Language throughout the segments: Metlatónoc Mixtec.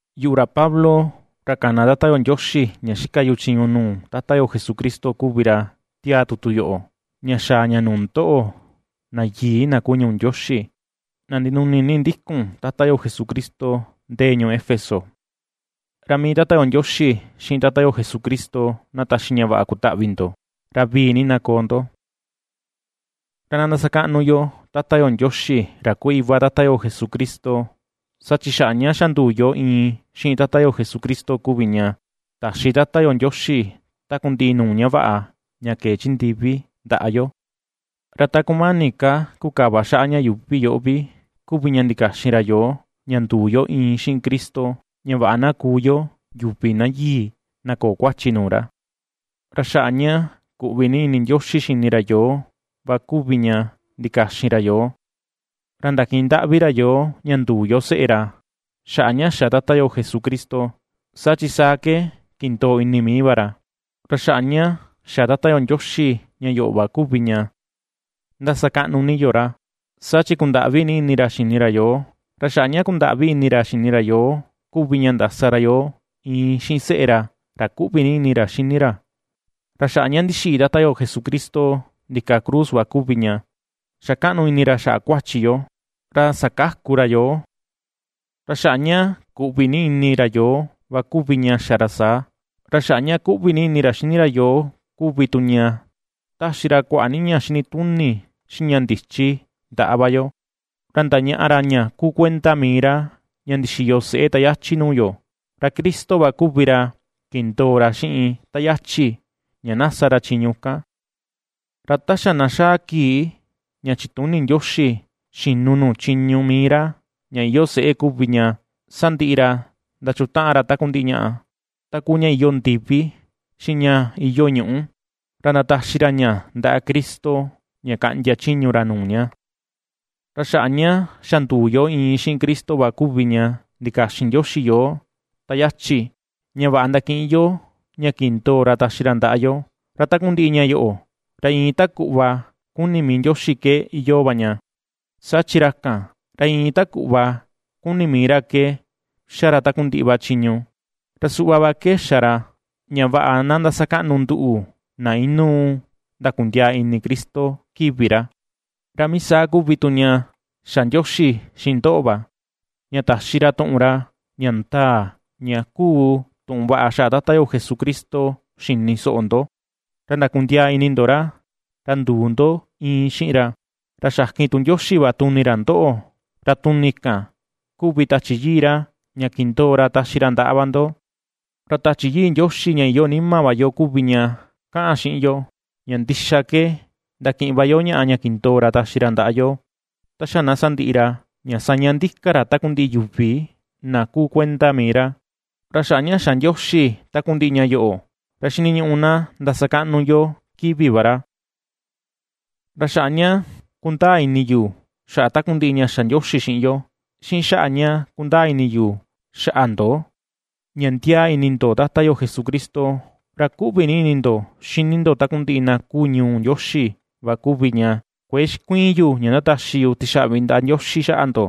Yuꞌu, ra Pablo, ra kana Tata yo Ndioxi, ña xika yu chiñu nuu Tata yo Jesucristo kuvi ra ^tiaa tutu yoꞌo ña xaa ña nuu ndoꞌo, na yii na kuu ñuu Ndioxi, na ndinuni ndikun Tata yo Jesucristo ndee ñuu Éfeso. Ra mii Tata yo Ndioxi, xiꞌin Tata yo Jesucristo, na taxi ña vaꞌa kutaꞌvi ndo, ra vivii na koo ndo. Ra na ndasakaꞌnu yo Tata yo Ndioxi, ra kuu iva Tata yo Jesucristo, saa chi xaꞌa ña xa nduu yo iin xiꞌin Tata yo Jesucristo kuvi ña, taxi Tata yo Ndioxi takundiꞌi nuu ña vaꞌa ña kee chi ndivi ndaꞌa yo. Ra ta kumani ka kukava xaꞌa ña yuuvi yoꞌo vi kuvi ña ndikaxin ra yoo ña nduu yo iin xiꞌin Cristo, ña vaꞌa na kuu yo yuvi na yii, na köo kuachi nuu ra. Ra xaꞌa ña kuꞌvi ni ini Ndioxi xini ra yoo va kuvi ña ndikaxin ra yoo, ra ndakiꞌin ndaꞌvi ra yoo ña nduu yo seꞌe ra, xaꞌa ña xa Tata yo Jesucristo, saa chi saa ke kindoo ini ni mii va ra. Ra xaꞌa ña xa Tata yo Ndioxi ña yoꞌo va kuvi ña ^ndasakaꞌnu ni yo ra, saa chi kundaꞌvi ni ini ra xini ra yoo, ra xaꞌa ña kundaꞌvi ini ra xini ra yoo kuvi ña ndasa ra yoo iin xiꞌin seꞌe ra, ra ^kuꞌvi ni ini ra xini ra. Ra xaꞌa ña ndixiꞌi Tata yo Jesucristo ndika cruz va kuvi ña xa kaꞌnu ini ra xaꞌa kuachi yo, ra sakaku ra yoo. Ra xaꞌa ña kuꞌvi ni ini ra yoo va kuvi ña xa ra saa. Ra xaꞌa ña kuꞌvi ni ini ra xini ra yoo kuvi tu ña, ^taxi ra kuaꞌa ni ña xinituni xiꞌin ña ndichi ndaꞌa va yo, ra ndañaꞌa ra ña kuu kuenda mii ra ña ndixiyo seꞌe ta yachi nuu yo, ra Cristo va kuvi ra kindoo ra xiꞌin ta yachi ña na sa ra chiñu kan. Ra ta xa na xaa kii ña chituni Ndioxi xinu nuu chiñu mii ra ña iyoo seꞌe kuvi ña sandiꞌi ra ndachutaꞌan ra takundiꞌi ñaꞌa, ta kuu ña iyoo ndivi, xiꞌin ña iyoo ñuꞌu, ra ndataxi ra ña ndaꞌa Cristo ña kaꞌndia chiñu ra nuu ña. Ra xaꞌa ña xa nduu yo iin xiꞌin Cristo va kuvi ña ndikaxin Ndioxi yoo ta yachi, ña vaꞌa ndakiꞌin yo ña kindoo ra taxi ra ndaꞌa yo; ra takundiꞌi ña yoꞌo, ra iin ta kuꞌva kuni mii Ndioxi ke iyoo va ña, saa chi ra kan, ra iin ta kuꞌva kuni mii va ra ke ^xa ra takundiꞌi chiñu. Ra suꞌva va ke xa ra, ña vaꞌa na ndasakaꞌnu nduꞌu, na inuu ndakundiaa ini Cristo, kivi ra. Ra mii saa kuvi tu ña xa Ndioxi xiꞌin ndoꞌo va, ña taxi ra tuꞌun ra, ña ndaa, ña kuu tuꞌun vaꞌa xaꞌa Tata yo Jesucristo xini soꞌo ndo, ra ndakundiaa ini ndo ra, ra nduu ndo iin xiꞌin ra, ra xakin tu Ndioxi va tuni ra ndoꞌo, ra tuni kan, kuvi Tachi Yii ra ña kindoo ra taxi ra ndaꞌa va ndo. Ra Tachi Yii Ndioxi ña iyoo nima va yo kuvi ña kaꞌan xiꞌin yo, ña ndixa ke ndakiꞌin va yo ñaꞌa ña kindoo ra taxi ra ndaꞌa yo, ta xa na sandiꞌi ra, ña saña ndika ra takundiꞌi yuvi na kuu kuenda mii ra. Ra xaꞌa ña xa Ndioxi takundiꞌi ña yoꞌo, ra xiniñuꞌu na ndasakaꞌnu yo kivi va ra. Ra xaꞌa ña kundaa ini yu xaꞌa takundiꞌi ña xa Ndioxi xiꞌin yo, xiꞌin xaꞌa ña kundaa ini yu xaꞌa ndo ña ndiaa ini ndo Tata yo Jesucristo, ra kuꞌvi ni ini ndo xini ndo takundiꞌi na kuu ñuu Ndioxi va kuvi ña, kuëe xikuiin yu ña ndataxi yu tixaꞌvi ndaꞌa Ndioxi xaꞌa ndo,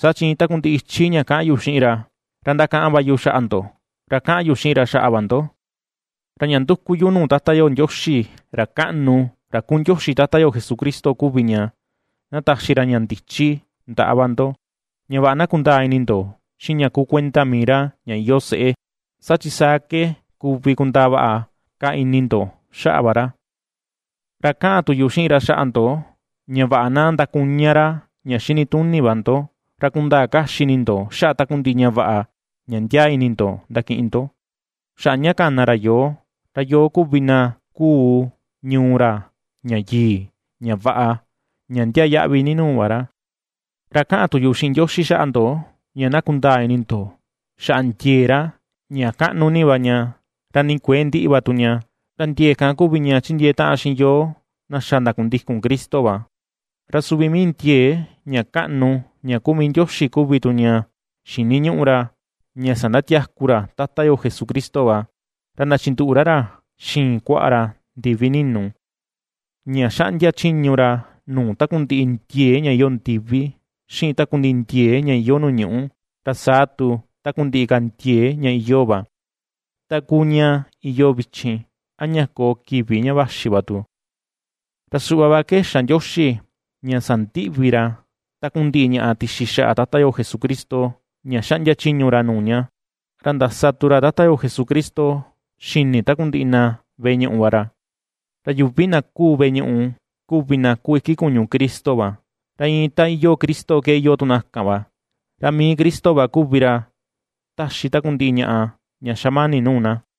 saa chi iin takundiꞌi ichi ña kaꞌan yu xiꞌin ra, ra ndakaꞌan va yu xaꞌa ndo, ra kaꞌan yu xiꞌin ra xaꞌa va ndo. Ra ña nduku yu nuu Tata yo Ndioxi, ra kaꞌnu, ra kuu Ndioxi Tata yo Jesucristo kuvi ña, na taxi ra ña ndichi ndaꞌa va ndo, ña vaꞌa na kundaa ini ndo xiꞌin ña kuu kuenda mii ra ña iyoo seꞌé, saa chi saa ke kuvi kundaa vaꞌa ka ini ndo xaꞌa va ra. Ra kaꞌan tu yu xiꞌin ra xaꞌa ndo, ña vaꞌa na ndakuña ra ña xinituni va ndo, ra kundaa kaxi ini ndo xaꞌa takundiꞌi ña vaꞌa ña ndiaa ini ndo ndakiꞌin ndo, xaꞌa ña kana ra yoo, ra yoo kuvi na kuu ñuu ra ña yii, ña vaꞌa, ña ndiaa yaꞌvi ni nuu va ra. Ra kaꞌan tu yu xiꞌin Ndioxi xaꞌa ndo ña na kundaa ini ndo xaꞌa ndiee ra ña kaꞌnu ni va ña, ra ni kuëe ndiꞌi va tu ña, ra ndiee kan kuvi ña ^chindiee taꞌan xiꞌin yoo na xa ndakundikun Cristo va. Ra suvi mii ndiee ña kaꞌnu ña kuu mii Ndioxi kuvi tu ña xiniñuꞌu ra ña sandatiaku ra Tata yo Jesucristo va, ra ndachinduꞌu ra ra xiin kuaꞌa ra ndivi ninu, ña ^xaꞌndia chiñu ra nuu takundiꞌi ndiee ña iyoo ndivi, xiꞌin takundiꞌi ndiee ña iyoo nuu ñuꞌu, ra saa tu takundiꞌi ka ndiee ña iyoo va, ta kuu ña iyoo vichin, a ña koo kivi ña vaxi va tu. Ra suꞌva va ke xa Ndioxi ña sandiꞌvi ra takundiꞌi ñaꞌa tixi xaꞌa Tata yo Jesucristo ña xaꞌndia chiñu ra nuu ña, ra ndasa tu ra Tata yo Jesucristo xini takundiꞌi na veꞌe ñuꞌu va ra. Ra yuvi na kuu veꞌe ñuꞌu kuvi na kuu iki kuñu Cristo va, ra iin ta iyoo Cristo ke iyoo tu na kan va; ra mii Cristo va kuvi ra ^taxi takundiꞌi ñaꞌa ña xamani nuu na.